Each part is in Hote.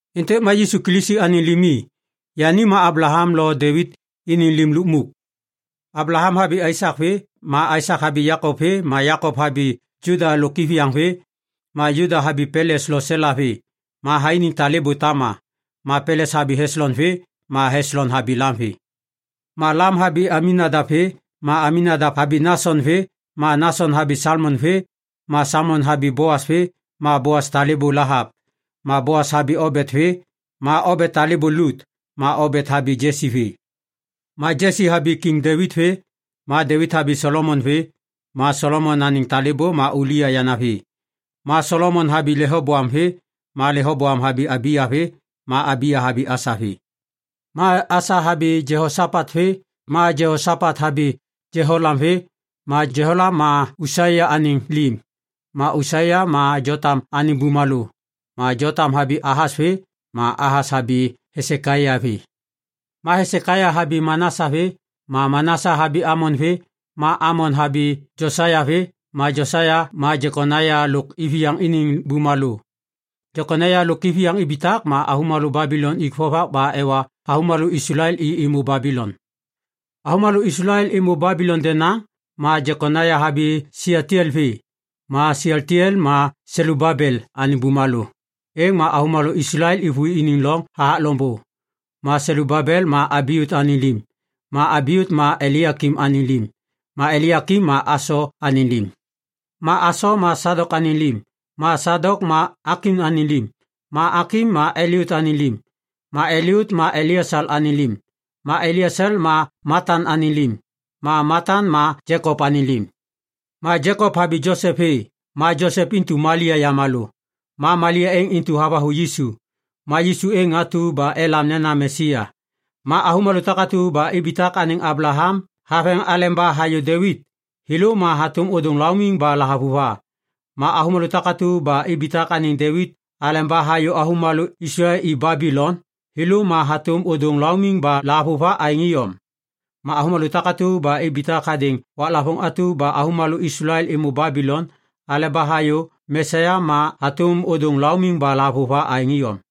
Êntêk ma Yisu Kilisi anêŋ limi. Yani ma Ablaham lo Devit iniŋ lim lukmuk. Ablaham habi Aisak vê, ma Aisak habi Jekop vê, ma Jekop habi Juda lôk iviyaŋ vê. Ma Juda habi Peles lo Sela vê, ma thainiŋ talêbô Tama. Ma Peles habi Heslon vê, ma Heslon habi Lam vê. Ma Lam habi Aminadap vê, ma Aminadap habi Nason vê, ma Nason habi Salmon vê. Ma Salmon habi Boas vê, ma Boas talêbô Lahap. Ma Boas habi Obet vê, ma Obet talêbô Lut. Ma Obet habi Jesi vê. Ma Jesi habi Kiŋ Devit vê. Ma Devit habi Solomon vê, ma Solomon anêŋ talêbô ma Ulia yanavi. Ma Solomon habi Lehoboam vê, ma Lehoboam habi Abiya vê, ma Abiya habi Asa vê. Ma Asa habi Jehosapat vê, ma Jehosapat habi Jeholam vê. Ma Jeholam ma Usaia anêŋ lim. Ma Usaia ma Jotam anêŋ bumalô, ma Jotam habi Ahas vê, ma Ahas habi Hesekaia vê. Ma Hesekaia habi Manasa vê, ma Manasa habi Amon vê, ma Amon habi Josaia vê. Ma Josaia ma Jekonaia lôk iviyaŋ iniŋ bumalô. Jekonaia lôk iviyaŋ ibitak ma avômalô Babilon ik vovak ba ewa avômalô Islael i êmô Babilon. Avômalô Islael êmô Babilon denaŋ, ma Jekonaia habi Sialtiel vê, ma Sialtiel ma Selubabel anêŋ bumalô. Êŋ ma avômalô Islael êvôi iniŋ loŋ hathak loŋbô. Ma Selubabel ma Abiut anêŋ lim, ma Abiut ma Elaiakim anêŋ lim, ma Elaiakim ma Aso anêŋ lim. Ma Aso ma Sadok anêŋ lim, ma Sadok ma Akim anêŋ lim, ma Akim ma Eliut anêŋ lim. Ma Eliut ma Eleasal anêŋ lim, ma Eleasal ma Matan anêŋ lim, ma Matan ma Jekop anêŋ lim. Ma Jekop habi Josep vê, ma Josep intu Malia yamalô. Ma Malia êŋ intu havathu Yisu. Ma Yisu êŋ atu ba elam nena “Mesia”. Ma avômalô takatu ba ibitak anêŋ Ablaham haveŋ aleba hayô Devit, thêlô ma hatôm ôdôŋ laumiŋ ba lahavuva. Ma avômalô takatu ba ibitak anêŋ Devit aleba hayô avômalô Islael i Babilon, thêlô ma hatôm ôdôŋ laumiŋ ba lahavuva aêŋ iyom. Ma avômalô takatu ba ibitak hadêŋ waklavôŋ atu ba avômalô Islael êmô Babilon aleba hayô Mesia ma hatôm ôdôŋ laumiŋ ba lahavuva aêŋ iyom.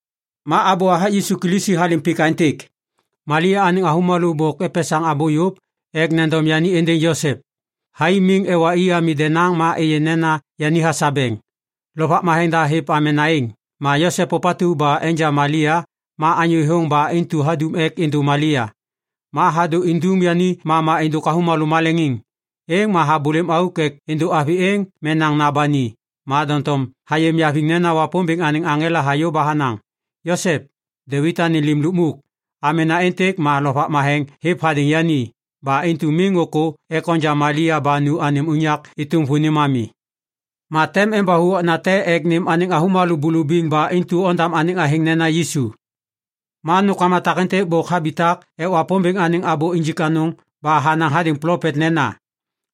Ma abô hathak Yisu Kilisi halêm pik aêntêk. Malia anêŋ avômalô bôk epesaŋ abô yôv ek nendom yani êndêŋ Josep. Thai miŋ ewa i ami denaŋ ma êyê nena yani hasabeŋ. Lovak Matheŋ da hêv amena êŋ. Ma Josep, ôpatu ba enja Malia ma anyô thêthôŋ ba intu hadum ek êndô Malia. Ma hadô indum yani mama êndôk avômalô maleŋiŋ. Êŋ ma habôlêm auk ek êndô avi êŋ menaŋna ba ni. Ma doŋtom hayê niaviŋ nena Wapômbêŋ anêŋ aŋela hayô ba hanaŋ, “Josep, Devit anêŋ lim lukmuk, amena êntêk ma Lovak Matheŋ hêv hadêŋ yani. Ba intu miŋ ôkô ek onja Malia ba nu anêm unyak êtôm vônim ami. Ma tem embathu okna te ek nêm anêŋ avômalô bulubiŋ ba intu ondam anêŋ athêŋ nena Yisu.” Ma nômkama takêntêk bôk habitak ek Wapômbêŋ anêŋ abô injik anôŋ ba hanaŋ hadêŋ plopet nena,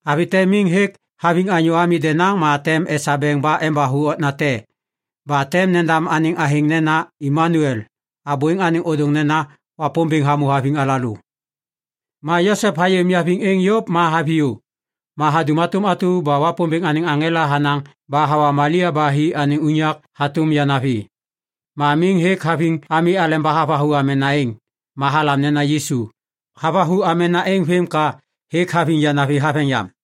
“Avi te miŋ hêk haviŋ anyô ami denaŋ ma tem esabeŋ ba embathu okna te. Ba tem nendam anêŋ athêŋ nena Imanuel.” Abô êŋ anêŋ ôdôŋ nena, “Wapômbêŋ hamô haviŋ alalô.” Ma Josep hayê niaviŋ êŋ yôv ma haviyô. Ma hadum hatôm atu ba Wapômbêŋ anêŋ aŋela hanaŋ ba hawa Malia ba hi anêŋ unyak hatôm yanavi. Ma miŋ hêk haviŋ ami aleba havathu amena êŋ. Ma halam nena Yisu. Havathu amena êŋ vêm ka hêk haviŋ yanavi haveŋ yam.